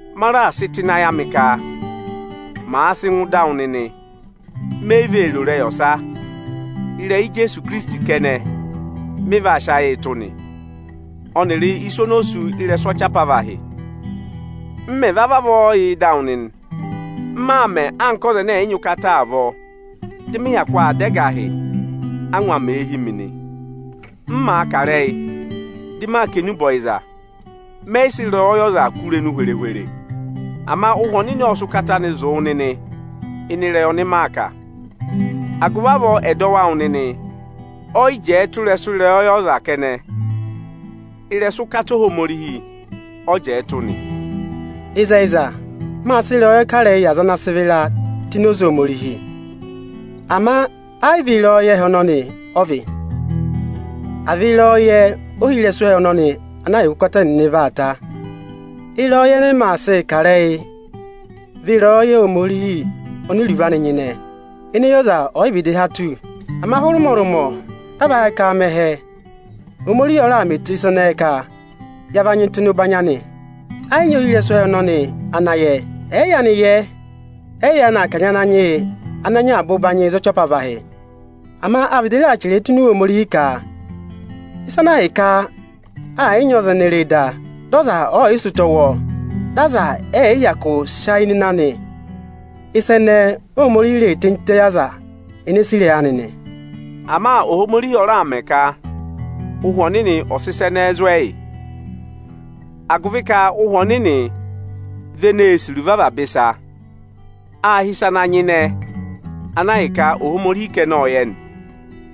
Maa raà sị tụ́ ịnị ayị ka màa va sị ngụ ịda awụ nịnị, me yi vee ro ịrẹyị ọsa, ịrẹyị Ijeesu Ikirisiti kẹnẹ mị vaa sị ayịị tụ́ nị, ọnịrị isu oni o sú ị́rẹsụ ọchị apavahị. M mẹ̀ vavọọ va yà ịda awụ nịnị, m maa mẹ̀ anka ọza ẹnẹ ẹ̀yị nyị ụkata avọọ, dị mị hyakụ aa dá ẹgahị, ángwa mèe hí mi nị. M màa kà ịrẹyị dị maa kà enube ọyịza, mẹyị sị ịrẹyọyẹ ọza kụ́ irenu hwere-hwere. Ama Ụhwẹ Ọnịnị ọ́ọ sị ụkata anị zụ̀ wụ nịnị ịnị ịrẹyị ọnị maa kà. Agụvị avọọ ẹdọwụ awụ nịnị ọyị jẹẹ tụ́ ịrẹsụ ịrẹyọyẹ ọza kẹnẹ; ịrẹsụ ụkata Ohomorihi ọ jẹẹ tụ́ nị. Ịzẹyịza, máa sị ịrẹyọyẹ kà ịrẹyị yị aza ana sị vịra tụ́ ini oze Ohomorihi. Ama ayị vị ịrẹyọyẹ ẹhẹ ọnọnị ọ vị, àa vị ịrẹyọyẹ ohirẹsụ ẹhẹ ọnọnị, ana ahịka ụkata ẹnịnị vaa ta. Ịrẹyọyẹ ẹnẹ ẹmị aa sịị kà ịrẹyị vị ịrẹyọyẹ Ohomorihi oni iruvo anị nyịnẹ, ene eyi ọza ọ̀yị vịdị há tù. Ama hụrẹ ụmọrụmọ dị a va yẹ ka aa mẹ ẹhẹ, Ohomorihi ọ raà mẹ eto ịsa ẹnẹẹ ka ya va nyị tụ́ ịnị ụbanyị anị. Ẹ yị nyị ohirẹsụ ẹhẹ ọnọnị ana yẹẹ. Ẹ̀ẹ yaanị yẹẹ, ẹyị yaanị kanyị Ananyị yị ana nyị avaba ụbanyị za ọchị apavahị. Ama áa vịdị chẹrẹẹ tụ́ ini Iwe Ohomorihi ka, “Ịsa ana ahịka ẹ yị nyị ọza ene re da, dị ọza ọọ̀yị sị ụtọ wụ́ ọọ, dị aza ẹ yị hyakụ sị ayị nọ ịnị anị, ịsa ẹnẹẹ Óhomorihi reè tenyi tịtẹ yị aza ene sì ịrẹyị anị nị.” Ama Ohomorihi ọ raà mẹ ka Ụhwẹ Ọnịnị ọ̀ sị ịsa ẹnẹẹ zụ̀ ẹyị. Agụvị ka Ụhwẹ Ọnịnị vị eneē sì iruvo avaba ịsa, à hị́ ịsa ana nyịnẹ ana ahịka Ohomorihi kẹnẹ ọ yẹ nị.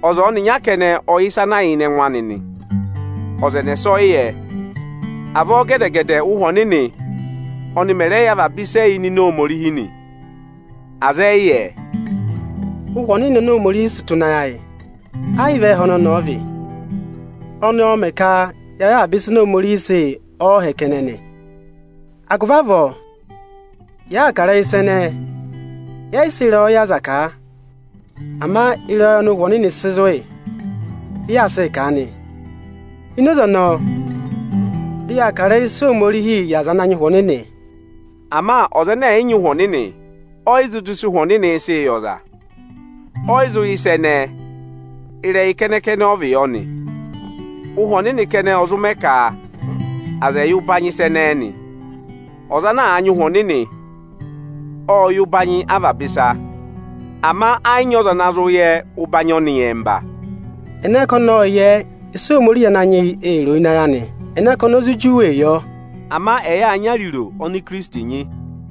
Ọza ọnịnya kẹnẹ ọ yẹ ịsa ana yà ịnịnẹ ẹngụ anị nị, ọza ẹnẹsa ọyị yẹ. Avọọ gẹdẹ-gẹdẹ Ụ́hwẹ Ọnịnị oni mẹ̀ rẹ yẹ avaba ịsị ẹ yà ịnịnẹ Ohomorihi nị; aza ẹyị yẹ. Ụ́hwẹ Ọnịnị oni Ohomorihi sị tụ́ ịnị ayị ayị, ayị vị ẹ́ẹhẹ ọnọnị ọ vị. Ọnị ọọ̄ mẹ̀ ka ya yẹ avaba ịsa oni Ohomorihi sị yị ọọhẹ kẹnẹ nị. Agụvị avọọ, yàa kà ịrẹyị ịsa ẹnẹẹ, yẹ yị sị ịrẹyọyẹ aza kà a. Ama ịrẹyọyẹ ọnị Ụhwẹ Ọnịnị sị zụ̀ yị, ị yaa sịị kà a nị. Ini oze ọnọọ, dị yaa kà ịrẹyị ịsa Ohomorihi yị aza ana nyị Ụhwẹ Ọnịnị. Ama ọza ẹnẹ ẹ̀yị nyị Ụhwẹ Ọnịnị, ọyị zụ dọ ịsị Ụhwẹ Ọnịnị ị̄ sịị yị ọza. Ọyị zụ yẹ ịsa ẹnẹẹ, ịrẹyị kẹnẹ-kẹnẹ ọ vị yọ nị. Ụhwẹ Ọnịnị kẹnẹ ọ zụ mẹ ka aza ẹ̀ yẹ ụbanyị ịsa ẹnẹẹ nị. Ọza ana nyị Ụhwẹ Ọnịnị ọ́ọ yẹ ụbanyị avaba ịsa; ama ẹ yị nyị ọza ana zụ yẹ ụbanyị ọnị nyẹmba. Anka a mẹ chẹrẹ ẹ, “Ẹnẹ ka ọnị ọ́ọ yẹ ịsị Ohomorihi Ananyị yị ee ro ịnị ayị anị? Ẹnẹ ka oni o zụ juwee yọ?” Ama ẹyị áa nyị ariro oni Ikirisiti nyị.